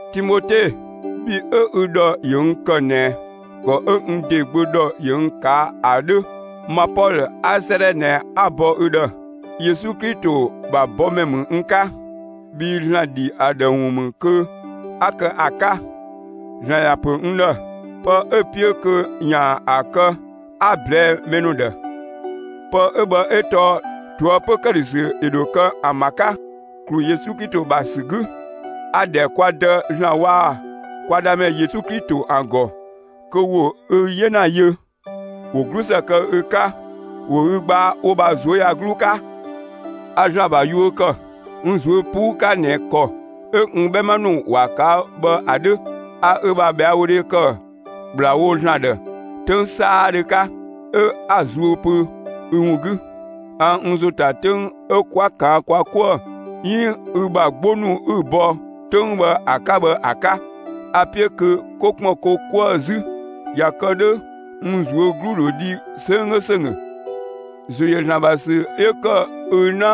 Timote, bhi 'ö ü ‑dhɔ ‑yö n ‑kë ꞊nɛ ‑kɔ 'ö n ‑de gbö ‑dhɔ ‑yö n ꞊kaa' ‑a 'dhö, ma Pɔlö 'a 'sëëdhɛ ꞊nɛ 'a‑ bɔ ü ‑dhë. Yesu Klito ‑bha bɔmɛ ‑mü n 'ka, bhii ‑Zlan ‑dhi ‑a ‑dhë ‑wun ‑mü kö 'a kë ‑a 'ka. ‑Zlan ‑ya ‑pö n ‑dhë, pë 'ö‑ 'piö kö ‑yaan ‑a kë 'a‑ ꞊blɛɛ'‑ mɛ ‑nu ‑dhë. Pë 'ö bhë 'ö tɔɔ ꞊toëpö ‑këdhösü ‑yö ‑dho kë ‑an ‑bha 'ka, ‑klu Yesu Klito ‑bha ‑sü 'gü. A‑ ‑dhɛ kwa Dë ‑Zlan waa‑ kwa Dëmɛ Yesu Klito ‑an ‑gɔ kö ‑wo ü 'yena yö, ‑wo 'glusë kë ü 'ka. ‑Wo ü gbaa wo ‑bha ꞊zuöyagluu 'ka. A ‑Zlan ‑bha yuö ‑kë, n ꞊zuö' 'puu 'ka ꞊nɛ ‑kɔ 'ö n 'bhɛma ‑nu ‑wa ꞊kaa' bhë ‑a 'dhö. A ü ‑bha ꞊bhɛawodhe ‑kë ‑kplawo ‑Zlan ‑dhë 'töng 'saadhö 'ka, 'ö 'a‑ zuö pö ü ‑wun 'gü. A n ‑zo ‑ta 'töng 'ö 'kwa kaan kwa 'kuë‑ 'iin ü ‑bha 'gbo ‑nu 'ü‑ bɔ 'töng bhë ‑a 'ka bhë ‑a 'ka. A‑ 'piö kö 'ko ‑kpën ko 'kuë‑ 'zü. ꞊Ya kë 'dhö n ꞊zuö' 'glu ‑dho dhi 'sönggö ‑sönggö. ‑Zo ‑yö ‑Zlan ‑bha ‑sü 'yö ‑kë ü 'na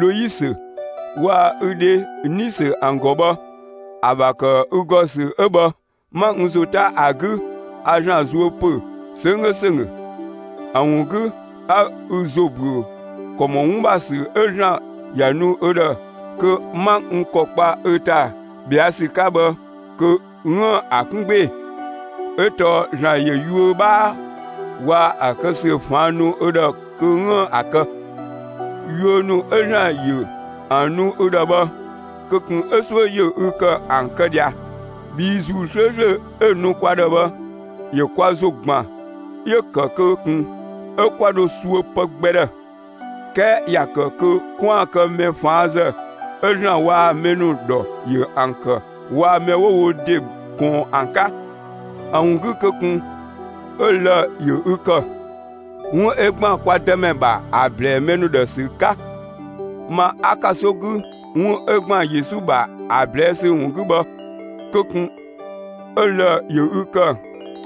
Loisö waa‑ ü dhe Nisö ‑an ‑gɔ bhë, ‑a ‑bha ‑kë ü ‑gɔ ‑sü 'ö bhë, 'ma n ‑zo 'ta ‑a 'gü a ‑Zlan zuö ‑pö 'sönggö ‑sönggö. ‑A ‑wun 'gü 'a ü ‑zo ‑büö ‑kɔ ‑mɔ 'wun ‑bha ‑sü 'ö ‑Zlan ‑ya nu ü ‑dhë kö 'ma n ‑kɔ kpa ü ‑ta ꞊bhɛa' ‑sü 'ka bhë kö 'üën‑ ‑a 'kun 'gbee‑! ('Ö tɔɔ ‑Zlan ‑yö yuö 'bhaa waa‑ ‑a kë ‑sü ‑faan ‑nu ü ‑dhë kö 'üën‑ ‑a kë.) Yuö ‑nu 'ö ‑Zlan ‑yö ‑an nu ü ‑dhë bhë kö ꞊kun 'ö 'suö ‑yö ü ‑kë ‑an kë ꞊dhia, bhii ‑Zuu 'slööslö 'ö‑ nu kwa ‑dhë bhë ‑yö kwa ‑zo ‑gban 'yö‑ ‑kë kö ꞊kun 'ö 'kwa dho suö pë gbɛ ‑dhë, 'kɛɛ ‑ya ‑kë kö 'kwaan‑ kë mɛ ꞊faanzë, 'ö ‑Zlan waa‑ mɛ ‑nu ‑dhɔ ‑yö ‑an ‑kë waa‑ mɛ 'wo wo ‑de ꞊kɔɔn ‑an 'ka. ‑A ‑wun 'gü kö ꞊kun 'ö lë‑ ‑yö ü ‑kë, 'wun 'ö ‑gban kwa Dëmɛ ‑bha ‑a ‑blɛɛ mɛ ‑nu ‑dhë ‑sü 'ka! Ma 'a ‑kanso 'gü 'wun 'ö ‑gban Yesu ‑bha ‑a ꞊blɛɛ' ‑sü ‑wun 'gü bhë, kö ꞊kun 'ö lë‑ ‑yö ü ‑kë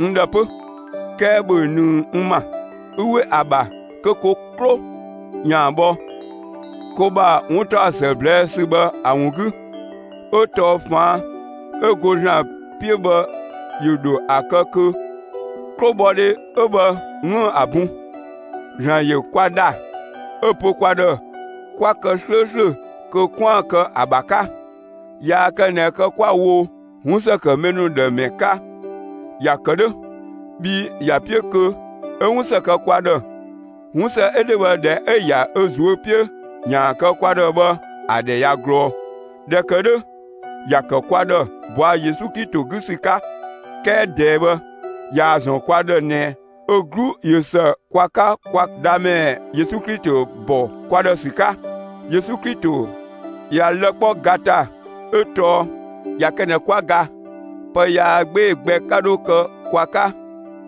n ‑dhë 'pö! 'Kɛɛ ‑bhö ꞊nëng n ‑ma, 'ü 'we ‑a ‑bha kö ko 'klo ‑yaan bhɔ, ko ‑bha 'wuntaɔsë ꞊blɛɛ' ‑sü bhë ‑a ‑wun 'gü! 'Ö tɔɔ ꞊faan' 'ö go ‑Zlan 'piö bhë ‑yö ‑dho ‑a kë kö 'klobhɔdhe 'ö bhë 'üën‑ ‑a bun. ‑Zlan ‑yö kwa ‑dha 'ö‑ pö kwa ‑dhë 'kwa kë 'slööslö kö 'kwaan‑ kë ‑a ‑bha 'ka. Yaa kë ꞊nɛ kë 'kwa‑ wo 'wun ‑së kë mɛ ‑nu ‑dhë ‑mɛ 'ka. ‑Ya ‑kë 'dhö, bhii ‑ya 'piö kö 'ö 'wunsë kë kwa ‑dhë. 'Wunsë 'ö 'dhö bhë ꞊dhɛ 'ö‑ ‑ya ö ꞊zuö' 'piö ‑yaan kë kwa ‑dhë bhë ‑a ‑dhɛ ꞊ya ꞊glɔɔ. ꞊Dhɛ ‑kë 'dhö ‑ya ‑kë kwa ‑dhë ꞊bɔa' Yesu Klito 'gü ‑sü 'ka. 'Kɛɛ ꞊dɛɛ bhë ꞊yaa‑ ‑zɔn kwa ‑dhë ꞊nɛ ö 'glu ꞊yö ‑së kwa 'ka kwa Dhamɛ Yesu Klito ‑bɔ kwa ‑dhë ‑sü 'ka. Yesu Klito ꞊ya lë‑ 'kpɔ ga ‑ta 'ö tɔɔ ꞊ya kë ꞊nɛ 'kwa ga, pë yaa 'gbee‑ gbɛ 'ka 'dho kë kwa 'ka.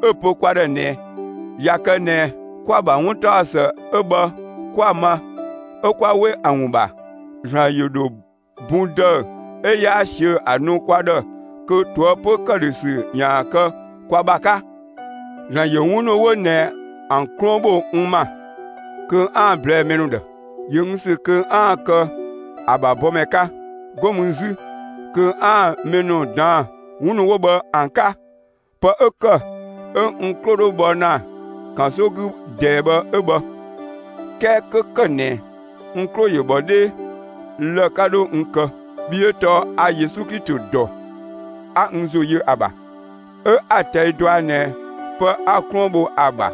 'Ö‑ pö kwa ‑dhë ꞊nɛ ꞊ya kë ꞊nɛ 'kwa‑ ‑bha 'wuntaɔsë 'ö bhë 'kwa‑ ma 'ö 'kwa 'we ‑a ‑wun ‑bha, ‑Zlan ‑yö ‑dho bun ‑dëü 'ö 'yaa ꞊siö' ‑a nu kwa ‑dhë kö ꞊toëpö ‑këdhösü ‑yaan kë kwa ‑bha 'ka. ‑Zlan ‑yö 'wun ‑nu 'wo ꞊nɛ ‑an 'kluën ‑bho n ‑ma kö 'aan‑ ꞊blɛɛ'‑ mɛ ‑nu ‑dhë. ‑Yö n ‑sü kö 'aan‑ kë ‑a ‑bha bɔmɛ 'ka, 'go mü 'zü kö 'aan‑ mɛ ‑nu ꞊daan'‑ 'wun ‑nu 'wo bhë ‑an 'ka. Pë 'ö ‑kë 'ö n 'klo 'dho bhɔ ‑na ‑kanso 'gü ꞊dɛɛ bhë 'ö bhë. 'Kɛɛ 'kö ‑kë ꞊nɛ n 'klo ‑yö ‑bhɔ 'dhee, lë‑ 'ka 'dho n kë, bhii 'ö tɔɔ a Yesu Klito ‑dɔ, 'a n ‑zo yö ‑a ‑bha, 'ö 'a‑ ꞊tɛi' dɔa ꞊nɛ pë 'a‑ 'kluën bho ‑a ‑bha,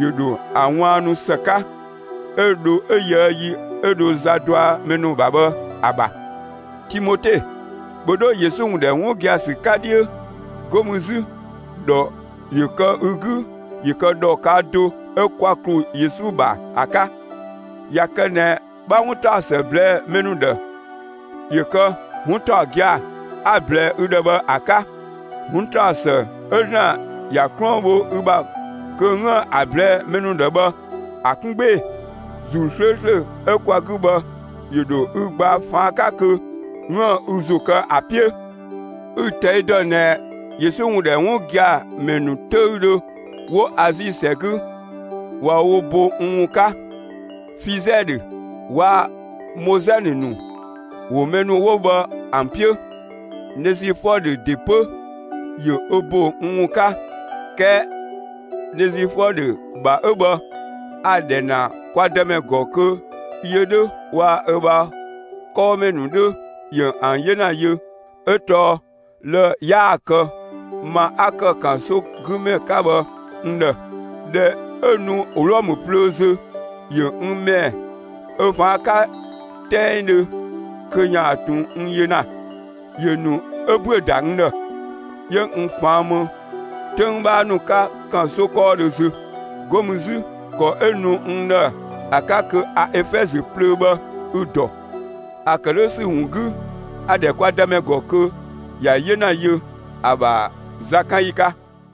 ‑yö ‑dho ‑a ꞊waannu ‑së 'ka, 'ö dho 'ö yöë yi 'ö dho za dɔa mɛ ‑nu ‑bha bhë ‑a ‑bha. Timote, ‑bhö 'dho Yesu ‑wun ‑dhɛ 'wun gia‑ ‑sü 'ka 'dhiö! 'Go mü 'zü ‑dhɔ ‑yö kë ü 'gü ‑yö kë ‑dhɔ ꞊kaa' do 'ö kwa ‑klu Yesu ‑bha ‑a 'ka! ꞊Ya kë ꞊nɛ 'bha 'wuntaɔsë ꞊blɛɛ'‑ mɛ ‑nu ‑dhë, ‑yö kë 'wun ‑taɔ gia‑ 'a‑ ꞊blɛɛ'‑ ü ‑dhë bhë ‑a 'ka. 'Wuntaɔsë 'ö ‑Zlan ‑ya 'kluën bho ü ‑bha kö 'üën‑ ‑a ꞊blɛɛ'‑ mɛ ‑nu ‑dhë bhë ‑a 'kun 'gbee‑! ‑Zuu 'slööslö 'ö kwa 'gü bhë ‑yö ‑dho ü gbaa ꞊faan' 'ka kö 'üën‑ ü ‑zo kë ‑a 'piö. Ü‑ ꞊tɛi' dɔ ꞊nɛ Yesu ‑wun ‑dhɛ 'wun gia‑ ‑mɛ ‑nu 'töüdhö 'wo Azi ‑sɛ 'gü ꞊wa wo bo n ‑wun 'ka. Fizɛdhö waa‑ Mozɛnë ‑nu ‑wo mɛ ‑nu 'wo bhë ‑an 'piö. (Nezifɔdhö ‑de 'pö ‑yö ö bo n ‑wun 'ka). 'Kɛɛ Nezifɔdhö ‑bha 'ö bhë, a‑ ‑dhɛ ‑na kwa Dëmɛ ‑gɔ kö yö 'dhö waa‑ ö ‑bha 'kɔɔmɛ ‑nu 'dhö ‑yö ‑an 'yena yö. 'Ö tɔɔ lë‑ 'yaa‑ kë ma 'a ‑kë ‑kansogümɛ 'ka bhë n ‑dhë. ꞊Dhɛ 'ö nu Wlɔmë plöö zö, ‑yö n ‑mɛɛ ö ꞊faan' 'ka 'tɛngdhö kö ‑yaan ꞊tun n yö ‑na. ‑Yö ‑nu 'ö ‑büö ‑da n ‑dhë, 'yö n ꞊faan' ‑më 'töng 'bhaa ‑nu 'ka ‑kanso 'kɔɔdhö zö. 'Go mü 'zü ‑kɔ 'ö nu n ‑dhë ‑a 'ka kö a Efɛzö plöö bhë 'ü‑ ‑dɔ. ‑A ‑kë 'dhö ‑sü ‑wun 'gü a‑ ‑dhɛ kwa Dëmɛ ‑gɔ kö ‑ya 'yena yö, ‑a ‑bha zakanyi 'ka.